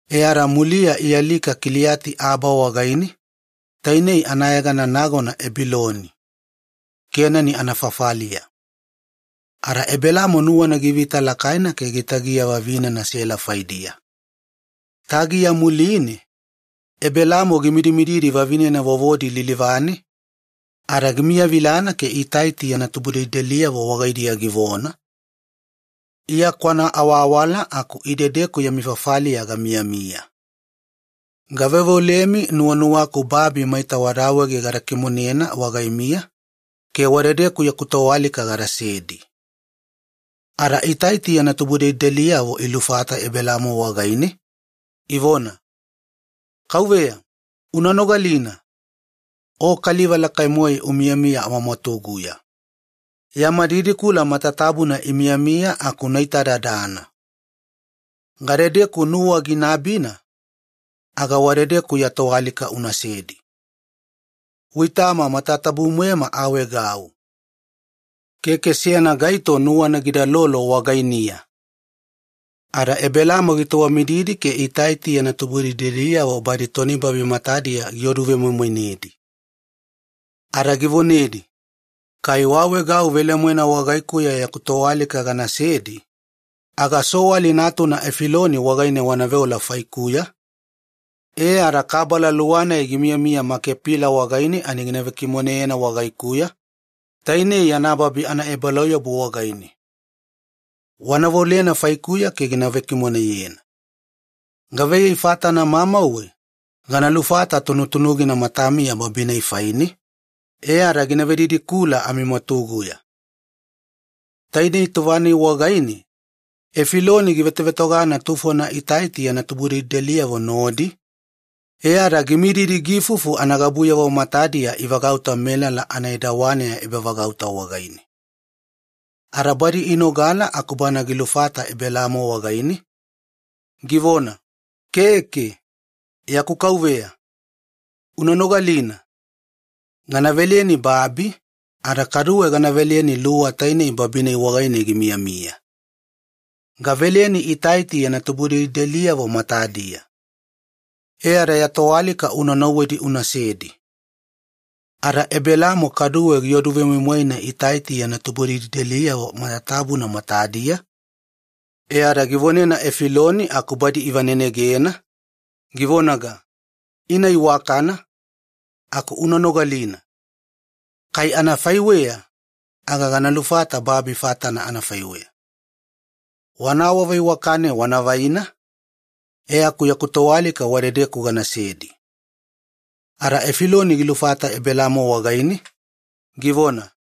E ada muliya ialika Kiliati-Aba wagaine, tainei anayegana nagona Ebiloni, Kenani anafafaliya. Ada Ebelaamo nuwana givita lakaina ke gitagiya vavinena Sela faidiya. Tagiya muline, Ebelaamo gimidimididi vavinena vovodi lilivane ada gimiyavilana ke Itaiti yana tubudelideliyavo wagaidiya givona, “Iya kwanaawaawala aku idedeku yami fafaliya gamiyamiya. Gaveoveolemi nuwanuwaku babi maita wada awaege gada kimonena wagaimiya ke wadedeku yaku toalika gadasedi.” Ada Itaiti yana tubudelideliyavo ilufata Ebelaamo wagaine, ivona, “Kauveya, una nogalina. O kaliva lakai-moe umiyamiya amamwatuguya. Yama didikula matatabuna imiyamiya aku una itadadana, gadedeku nuwa gina abina aga wadedeku ya toalika unasedi. Uitama matatabu-moema aawaegau, keke seyana gaito nuwana gidalolo wagainiya.” Ada Ebelaamo gitowamididi ke Itaiti yana tubudelideliyavo badi tonibabi matadiya gioduvemoimoinedi. Ada givonedi, “Kai waawaegau velemoena wagaikuya yaku toalika ganasedi, aga Soali natuna Efiloni wagaine wanaveola faikuya, e ada Makepila wagaine kabala luwa gina vekimoneyena wagaikuya. Banae toniluwa, kabala luwa-nai gimiyamiya yana babi anaebalauyabu wagaine. Wanaveolena faikuya ke gina vekimoneyena, gavaiyei fatana mamauwe gana lufata tunutunugina matamiya babi-nai faine ke gina vedidikula amimwatuguya.” Taidei tova-nai wagaine Efiloni givetovetogana tufona Itaiti yana tubudelideliyavo nodi, e ada gimididi giifufu anagabuyavo matadiya ivagauta melala anaedawaneya ebavagauta wagaine, ani inogala aku bana gilufata Ebelaamo wagaine, givona, “Keke, yaku kauveya. Una nogalina. Gana veleni babi, ada kaduwe gana veleni luwa tainei babi-nai wagaine gimiyamiya. Gaveleni Itaiti yana tubudelideliyavo matadiya. E ada ya toalika una nauwedi unasedi.” Ada Ebelaamo kaduwe giodu vemoimoina Itaiti yana tubudelideliyavo matatabuna matadiya, e ada givonena Efiloni aku badi ivanenegena, givonaga, “Ina iwakana, aku una nogalina. Kai anafaiweya, aga gana lufata babi fatana anafaiweya. Wana awaveiwakane wanavaina, e aku yaku toalika wadedeku ganasedi.” Ada Efiloni gilufata Ebelaamo wagaine, givona,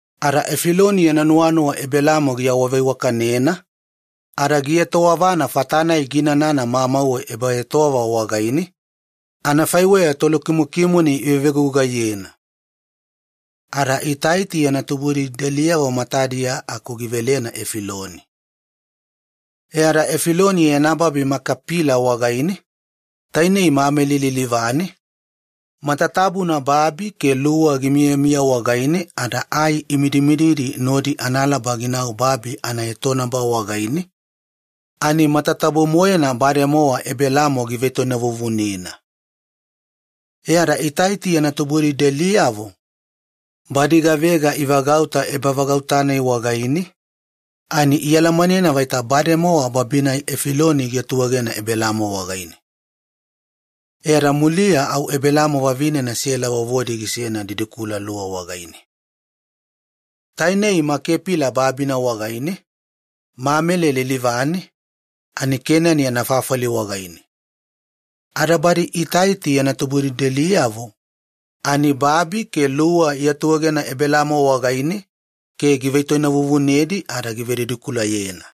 Ada Efiloni yana nuwanuwa Ebelaamo giawaveiwakanena ada gietowavana fata-nai giinana mamauwe ebaetowava wagaine, anafaiweya tolukimokimone ivevegugaiyena, ada Itaiti yana tubudelideliyavo matadiya aku givelena Efiloni. E ada Efiloni yana babi Makepila wagaine, tainei Mamele lilivane, matatabuna babi ke luwa gimiyamiya wagaine ada ai imidimididi nodi analaba ginau babi anaetonaba wagaine, ani matatabu-moena bademowa Ebelaamo givetoinavuvunena. E ada Itaiti yana tubudelideliyavo badi gavega ivagauta ebavagauta-nai wagaine, ani ialamanena vaita bademowa babi-nai Efiloni giatuegena Ebelaamo wagaine. E ada muliya au Ebelaamo vavinena Sela vovodi gisena didikula-luwa wagaine. Tainei Makepila babina wagaine, Mameli lilivane, ani Kenani anafafali wagaine. Ada badi Itaiti yana tubudelideliyavo ani babi ke luwa iatuegena Ebelaamo wagaine ke givetoinavuvunedi ada givedidikulayena.